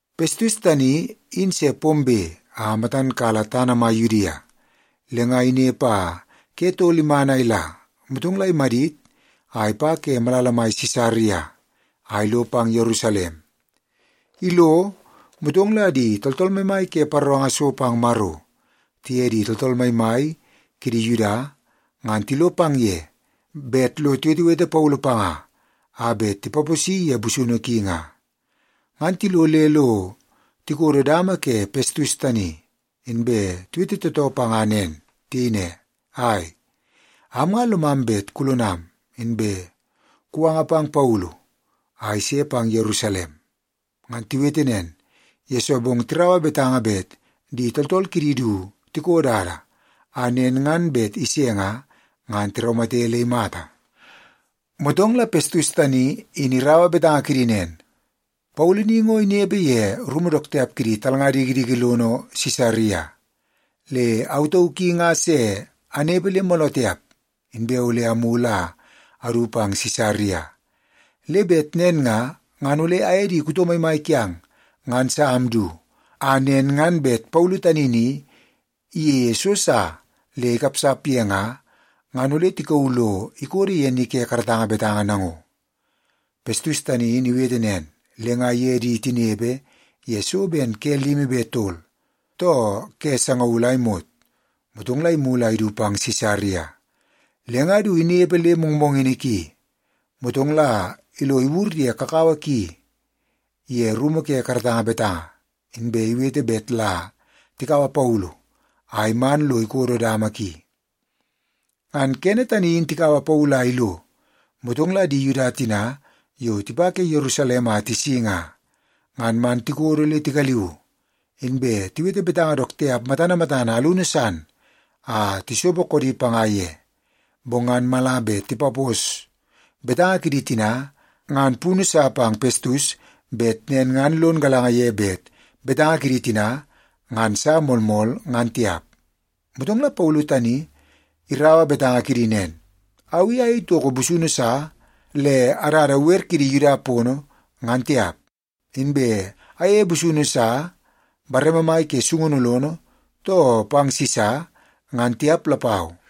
Pestus tani in se pombe a matan kala tana mai Yudia. Le nga inepe a ke tol iman a ila, motong la imadit a ipa ke malala mai Sisaria, a ilo pang Yerusalem. Ilo, motong la di tooltool maimai ke paroranga so pang Maro tiye di tooltool maimai kidi Yuda ngan tilo pang ye bet lo tiwetewete Paulu panga a bet tipaposi ye busunu ki nga. Ngan tilo le lo tikodo dama ke Pestus tani, inbe tiwete tootoo panga nen. Tiyei ne, “Ai, am nga lomam bet kulonam, inbe kuwanga pang Paulu a ise pang Yerusalem.” Ngan tiwete nen, yesoo bong tiraua betanga bet di tooltool kidi du tiko dada a nen ngan bet ise nga, ngan tiraumate le imata. Motong la Pestus tani in iraua betanga kidi nen, “Paulu ni ngo inepe ye rumu dook tiap kidi talnga dikidiki lono Sisaria. Le au tauk i nga se anepe le mooloo tiap, inbe ole amulu a adu pang Sisaria. Le bet nen nga, ngan ole aye di kuto maimai kiang ngan sa amdu, a nen ngan bet Paulu tani ni iyeie so sa le ikapsap ye nga, ngan ole tikauu lo ikodo ye ni ke karatanga betanga nango.” Pestus tani in iwete nen, le nga iye di tinepe ye so ben ke limi be tol, too ke sangaul a imot, motong la imulu a idu pang Sisaria. Le nga du inepe le mongmongini ki, motong la ilo iwur ye kakawa ki ye rumu ke karatanga betanga, inbe iwete bet la tikaua Paulu a iman lo ikodo dama ki. Ngan kene tani in tikaua Paulu a ilo, motong la di Yuda tina yo tipa ke Yerusalem a tisi nga, ngan man tikodo le tigaliu, inbe tiwete betanga dook tiap matana matana alunu san a tisopo koodi panga ye. Bong ngan mala bet tipapos betanga kidi tina ngan punu sa pang Pestus bet nen ngan lon galanga ye bet betanga kidi tina ngan sa moolmool, ngan tiap. Motong la Paulu tani iraua betanga kidi nen, “Au i ayei toko busunu sa le adada wer kidi Yuda pono, ngan tiap. Inbe ayeie busunu sa bareme mai ke sungunu lono, too pang Sisa, ngan tiap lapau.”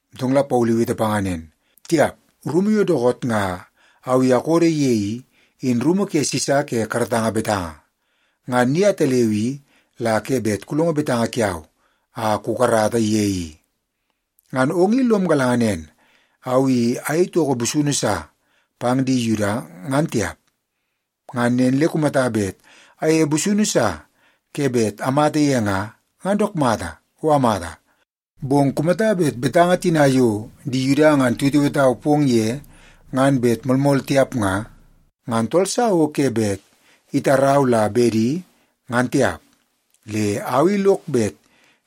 Motong la Paulu iwete panga nen, “Tiap! Rumu yo dookoot nga au i akododo ye i, in rumu ke Sisa ke karatanga betanga. Ngan ni ataleu i, la ke bet kulongo betanga kiau a kukarata ye i. Ngan ong in lom galanga nen, au i ayei toko busunu sa pang di Yuda, ngan tiap. Ngan nen le kumata bet ayeie busunu sa ke bet amata ye nga, ngan dook mata, o amata. Bong kumata bet betanga tina yo di Yuda nga tiwetewetau pong ye ngan bet moolmool tiap nga, ngan tool sa o ke bet itarau la bedi, ngan tiap. Le au i lok bet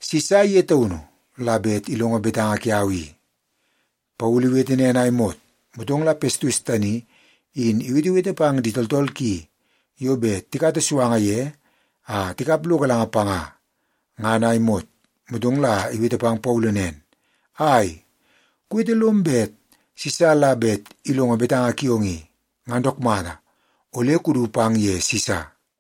Sisa ye taunu la bet ilongo betanga kiau i.” Paulu iwete nen a imot, motong la Pestus tani in iwetewete pang di tooltool ki yo bet tikata suanga ye a tikap lo galanga panga ngan a imot. Motong la iwete pang Paulu nen, “Ai, kuwete lom bet Sisa la bet ilongo betanga kiong i, ngan dook mata. Ole kudu pang ye Sisa.”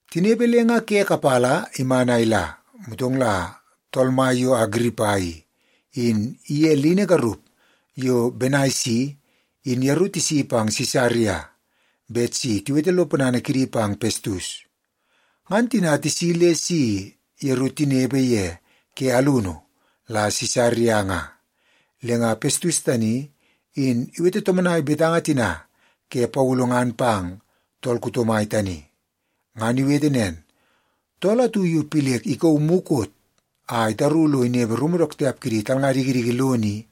Tinepe le nga ke kapala iman a ila, motong la tool mai yo Agiripa i, in iye lini garup yo Benaisi in yeru tisi pang Sisaria bet si tiwete lo ponana kidi pang Pestus. Ngan tina tisi le si yeru tinepe ye ke alunu la Sisaria nga, le nga Pestus tani in iwete tomonai betanga tina ke Paulu ngan pang tool kuto mai tani. Ngan iwete nen, “Tool atu yo Pilek ikauu mukot a itaru lo inepe rumu dook tiap kidi talnga dikidiki lono i,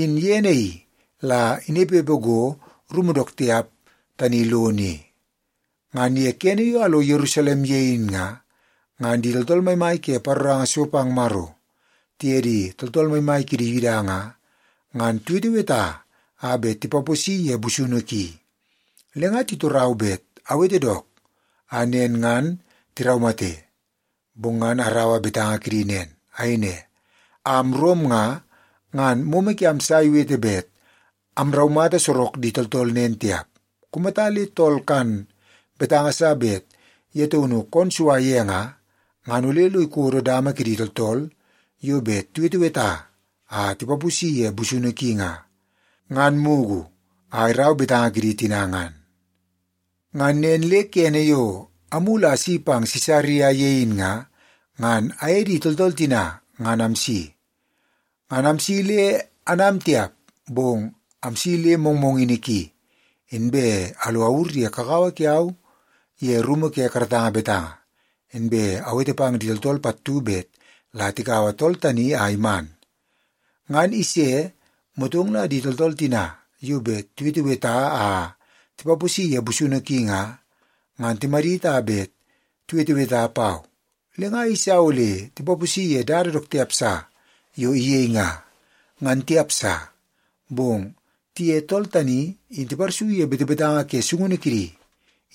in ye naii la inepepe go rumu dook tiap tani lono i. Ngan ye kene yo alo Yerusalem ye in nga, ngan di tooltool maimai ke paroranga so pang Maro, tiye di tooltool maimai kidi Yuda nga, ngan tiweteweta a bet tipaposi ye busunu ki. Le nga titorau bet awete dook, a nen ngan tiraumate. Bong ngan araua betanga kidi nen. Ayei ne, ‘Am Rom nga, ngan momo kiam sa iwete bet amraumata sorok di tooltool nen tiap. Kumata le tool kan betanga sa bet ye taunu koon sua ye nga, ngan ole lo ikodo dama kidi tooltool yo bet tiweteweta a tipaposi ye busunu ki nga, ngan mugu a irau betanga kidi tina ngan.’ “Ngan nen le kene yo amulu a asi pang Sisaria ye in nga, ngan aye di tooltool tina ngan amsi. Ngan amsi le anam tiap, bong amsi le mongmongini ki, inbe alo awur ye kakawa kiau ye rumu ke karatanga betanga, inbe awete pang di tooltool pattu bet la tikaua tool tani a iman. Ngan ise, motong la di tooltool tina yo bet tiweteweta a tipaposi ye busunu ki nga, ngan timadit a bet tiweteweta pau. Le nga ayeisa ole tipaposi ye dada dook tiap sa yo iyei nga, ngan tiap sa. Bong tiye tool tani in tiparsu ye betanga ke sungunu kidi,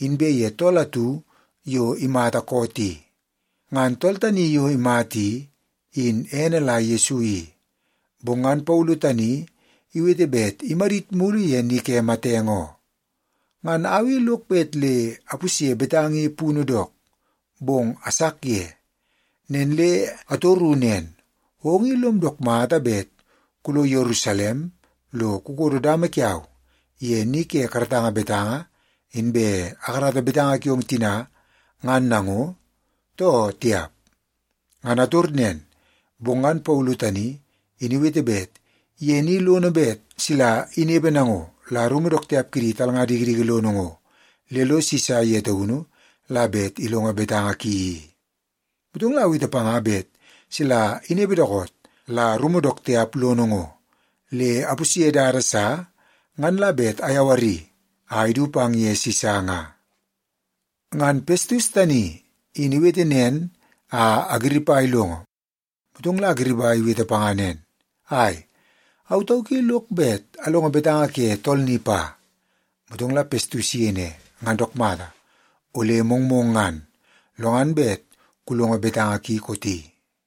inbe ye tool atu yo imata koot i. Ngan tool tani yo imata i, in ene la Yesu i, bong ngan Paulu tani iwete bet imadit mulu ye ni ke matenge oo. Ngan au i lok bet le apusye betanga i punu dook, bong asak ye. Nen le atoru nen, ‘Ong i lom dook mata bet kulo Yerusalem lo kukodo dama kiau ye ni ke karatanga betanga, inbe akarata betanga kiong tina ngan nango, too tiap?’ Ngan ator nen, bong ngan Paulu tani in iwete bet ye ni lono bet sila inepe nango la rumu dook tiap kidi talnga dikidiki lono ngo, le lo Sisa ye taunu la bet ilongo betanga ki i. Motong la awete panga bet sila inepe dookoot la rumu dook tiap lono ngo, le apusye dada sa, ngan la bet ayawari a idu pang ye Sisa nga.” Ngan Pestus tani in iwete nen a Agiripa ilongo, motong la Agiripa iwete panga nen, “Ai, au tauk i lok bet alongo betanga ke tool ni pa.” Motong la Pestus iyei ne, “Ngan dook mata, ole mongmong ngan, lo ngan bet kulongo betanga ki kooti.”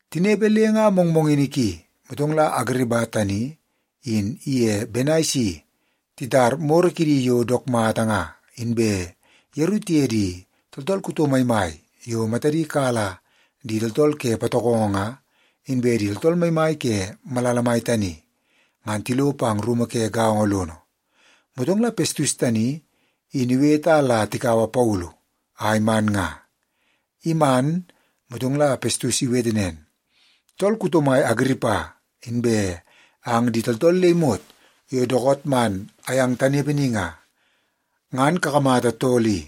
Tinepe le nga mongmongini ki, motong la Agiripa tani in iye Benaisi titar moro kidi yo dook mata nga, inbe yeru tiye di tooltool kuto maimai yo matadi kala di tooltool ke patokongo nga, inbe di tooltool maimai ke malala mai tani, ngan tilo pang rumu ke gaongo lono. Motong la Pestus tani in iwete a la tikaua Paulu a iman nga. Iman, motong la Pestus iwete nen, “Tool kuto mai Agiripa, inbe ang di tooltool le imot yo dookoot man amyang tanepe ni nga, ngan kakamata tool i.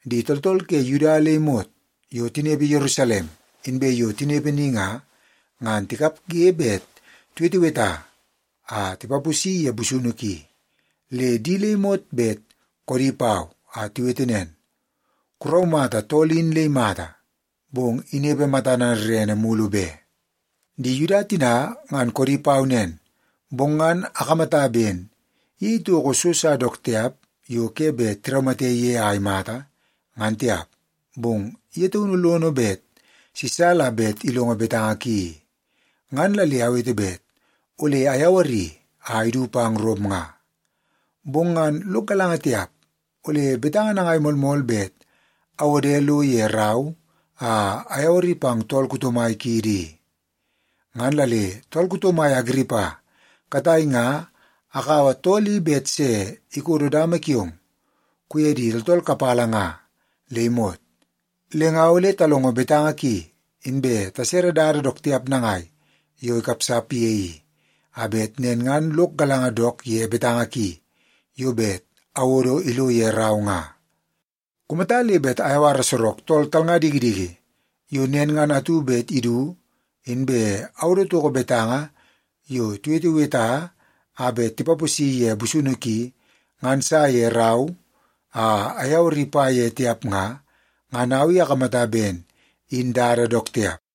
Di tooltool ke Yuda le imot yo tinepe Yerusalem, inbe yo tinepe ni nga, ngan tikapge bet tiweteweta a tipaposi ye busunu ki. Le di le imot bet koodi pau, a tiwete nen, ‘Kuraumata tool in le imata, bong inepe matana rere mulu be.’ Di Yuda tina ngan koodi pau nen, bong ngan akamata ben iyei toko so sa dook tiap yo ke bet tiraumate ye a imata, ngan tiap. Bong ye taunu lono bet Sisa la bet ilongo betanga ki i. Ngan la le awete bet ole ayawari a idu pang Rom nga. Bong ngan lok galanga tiap, ole betanga nangai moolmool bet awode lo ye rau a ayawari pang tool mai kiidi i. Ngan la le tool kuto mai Agiripa, katai nga akaua tool i bet se ikodo dama kiong kuye di tooltool kapala nga le imot. Le nga ole talongo betanga ki, inbe tasere dada dook tiap nangai yo ikapsap ye i, a bet nen ngan lok galanga dook ye betanga ki yo bet awodo ilo ye rau nga. Kumata le bet ayawara sorok tool talnga dikidiki yo nen ngan atu bet idu, inbe awodo toko betanga yo tiweteweta a bet tipaposi ye busunu ki ngan sa ye rau a ayawari pa ye tiap nga, ngan au i akamata ben in dada dook tiap.”